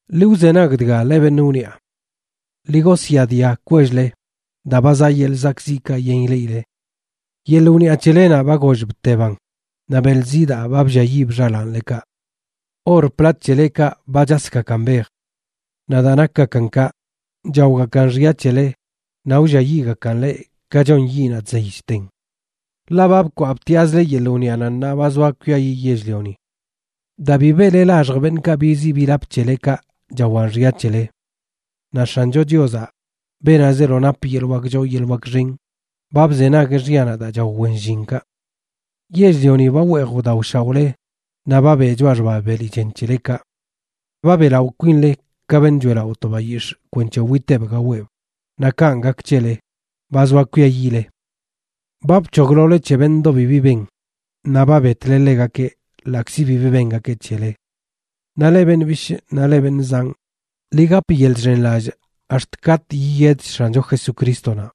Ḻi wzenag dga, leꞌ beṉꞌ wniꞌa. ¡Ḻi gosyaadia kwell-le, daa ba zaꞌ yeḻꞌ ziꞌkaꞌ yen ileꞌile! Yeḻꞌ wniꞌa c̱helenaꞌ ba goollꞌ bteban; naꞌ beḻ zidaa ba blliayiib xalaanlekaꞌ. Or plat c̱helekaꞌ ba chasgakan bej. Naꞌ daa nakgakan kaꞌ, chaogakan xya c̱hele naꞌ wlliayiꞌgakan leꞌ ka chon yiꞌnaꞌ chzey chten. Ḻaꞌ ba bkwaꞌ btiꞌazle yeḻꞌ wniꞌanaꞌ ṉaa ba zoa kwiayiꞌ yell-lioni. Daa bi beꞌle laxj beṉꞌkaꞌ biziꞌ bilap c̱helekaꞌ chawan xya c̱hele. Naꞌ X̱ancho Chiozaꞌ, beenaꞌ zeelo nap yeḻꞌ wak choo yeḻꞌ wak xen, ba bzenagueꞌ xyanaꞌ daa chao wen llinkaꞌ. Yell-lioni ba weej wdaoshaoꞌle naꞌ ba beꞌ choꞌa xba beli chen c̱helekaꞌ. Ba beꞌlaꞌo kwinle ka beṉꞌ choeꞌlaꞌo to bayix̱ꞌ kwenc̱he witeꞌb gaweꞌb, naꞌ kanꞌ gak c̱hele, ba zoa kwiayiꞌle. Ba bc̱hoglole c̱he beṉꞌdoꞌ bibi ben, naꞌ ba betle ḻegakeꞌ, ḻaꞌkzi bibi bengakeꞌ c̱hele. Naꞌ leꞌ beṉꞌ bishꞌ naꞌ leꞌ beṉꞌ zanꞌ, ḻi gap yeḻꞌ chxenlallꞌ ax̱t katꞌ yiyedch X̱ancho Jesucrístonaꞌ.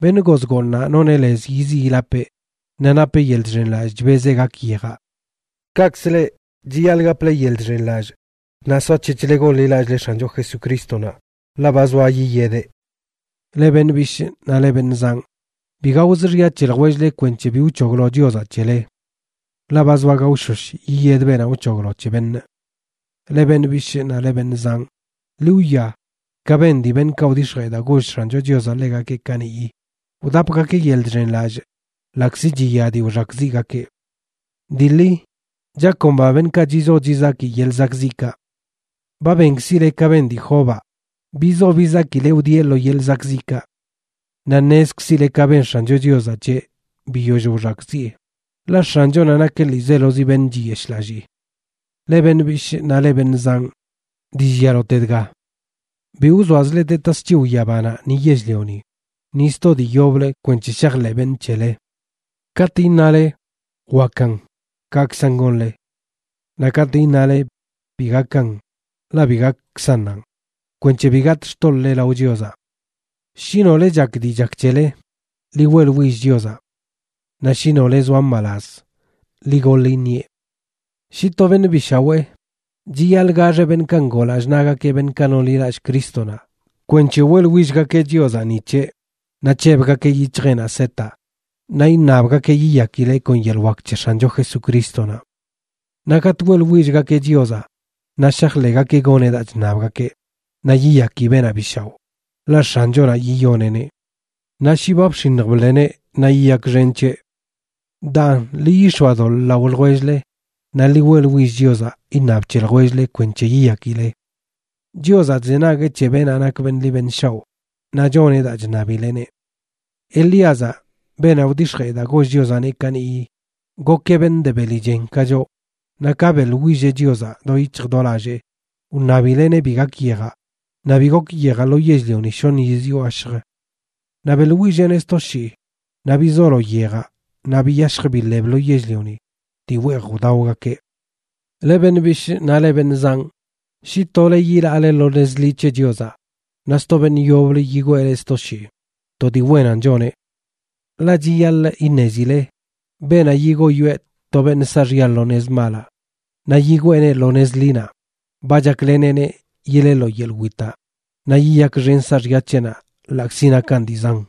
Beṉꞌ goz gooṉaꞌ noneꞌ lez yiziꞌ yilapeꞌ, naꞌ napeꞌ yeḻꞌ chxenlallꞌ chbezeꞌ gak yejaꞌ. Kaꞌkzə leꞌ, chiyaḻꞌ gaple yeḻꞌ chxenlallꞌ naꞌ soac̱hec̱hle gonḻilallꞌle X̱ancho Jesucrístonaꞌ, ḻaꞌ ba zoa yiyedeꞌ. Leꞌ beṉꞌ bishꞌ naꞌ leꞌ beṉꞌ zanꞌ, bi gaoz xya c̱he ljwell-le kwenc̱he bi wc̱hoglo Chiozaꞌ c̱hele. Ḻaꞌ ba zoa gaoshosh yiyed beenaꞌ wc̱hoglo c̱he beṉꞌ. Leꞌ beṉꞌ bishꞌ naꞌ leꞌ beṉꞌ zanꞌ, ḻi wwia ka ben dii beṉꞌkaꞌ wdix̱jee daa goll X̱ancho Chiozaꞌ ḻegakeꞌ kaniꞌyi, wdapgakeꞌ yeḻꞌ chxenlallꞌ ḻaꞌkzi chiya dii wxakꞌziꞌgakeꞌ. Dii ḻi, chakomba beṉꞌkaꞌ chizo chizaki yeḻꞌ zakꞌziꞌkaꞌ. Ba benkzile ka ben dii Jobaꞌ, bizo bizakileꞌ wdieꞌ lo yeḻꞌ zakꞌziꞌkaꞌ. Naꞌ ṉezkzile ka ben X̱ancho Chiozaꞌ c̱heꞌ biyoll wxakꞌziꞌe, ḻaꞌ X̱anchonaꞌ nakeꞌ ḻiizelozi beṉꞌ chiyeshꞌlallii. Leꞌ beṉꞌ bishꞌ naꞌ leꞌ beṉꞌ zanꞌ, dii llialote dga: bi wzoazle de tasc̱hiw yabanaꞌ ni yell-lioni, ni sto dii yoblə kwenc̱he shajḻeꞌ beṉꞌ c̱hele. Katꞌ iṉale: “wakan”, kaꞌkzan gonle. Naꞌ katꞌ iṉale: “bi gakan”, ḻaꞌ bi gakkzannanꞌ, kwenc̱he bi gatꞌ xtoḻꞌle lao Chiozaꞌ. Shi nole chak dii chak c̱hele, ḻi weꞌḻwill Chiozaꞌ. Naꞌ shi nole zoa mbalaz, ḻi goḻ iṉieꞌ. Shi to beṉꞌ bi shawee, chiyaḻꞌ gaxeꞌ beṉꞌkaꞌ ngoo lallꞌ naꞌgakeꞌ beṉꞌkaꞌ nonḻilallꞌ Crístonaꞌ kwenc̱he weꞌḻwillgakeꞌ Chiozaꞌ ni c̱heꞌ, naꞌ c̱hebgakeꞌ yic̱hjeꞌnaꞌ setaꞌ naꞌ iṉabgakeꞌ yiyakileꞌ kon yeḻꞌ wak c̱he X̱ancho Jesucrístonaꞌ. Naꞌ katꞌ weꞌḻwillgakeꞌ Chiozaꞌ naꞌ shajḻeꞌgakeꞌ goneꞌ daa chṉabgakeꞌ, naꞌ yiyaki beenaꞌ bi shaoꞌ, ḻaꞌ X̱anchonaꞌ yiyoneꞌneꞌ. Naꞌ shi ba bx̱iṉj bḻeneꞌ naꞌ yiyakxen c̱heꞌ. Daan, ḻi yix̱oadoḻꞌ lao ljwell-le naꞌ ḻi weꞌḻwill Chiozaꞌ iṉab c̱he ljwell-le kwenc̱he yiyakile. Chiozaꞌ chzenagueꞌ c̱he beenaꞌ nak beṉꞌ ḻi beṉꞌ shaoꞌ, naꞌ choneꞌ daa chṉabileꞌneꞌ. Elíazaꞌ, beenaꞌ wdix̱jee daa goll Chiozaꞌneꞌ kaniꞌyi, gokeꞌ beṉꞌ de beli chen ka choꞌ, naꞌ ka beꞌḻwilleꞌ Chiozaꞌ do yic̱hj do lallee wṉabileꞌneꞌ bi gak yejaꞌ, naꞌ bi gok yejaꞌ lo yell-lioni shoṉ yiz yo gashjə. Naꞌ beꞌḻwilleꞌneꞌ sto shii, naꞌ bizolo yejaꞌ naꞌ biyashj biḻeb lo yell-lioni dii weej wdaogakeꞌ. Leꞌ beṉꞌ bishꞌ naꞌ leꞌ beṉꞌ zanꞌ, shi tole yilaale lo nez ḻi c̱he Chiozaꞌ, naꞌ sto beṉꞌ yoblə yigwee leꞌ sto shii, to dii wenan choneꞌ. Ḻaꞌ chiyaḻꞌ iṉezile beenaꞌ yigoyoeꞌ to beṉꞌ saaxya lo nez malaꞌ naꞌ yigweeneꞌ lo nez ḻinaꞌ, ba chakleneꞌneꞌ yileꞌ lo yeḻꞌ witaꞌ naꞌ yiyakxen saaxya c̱heꞌnaꞌ ḻaꞌkzi nakan dii zan.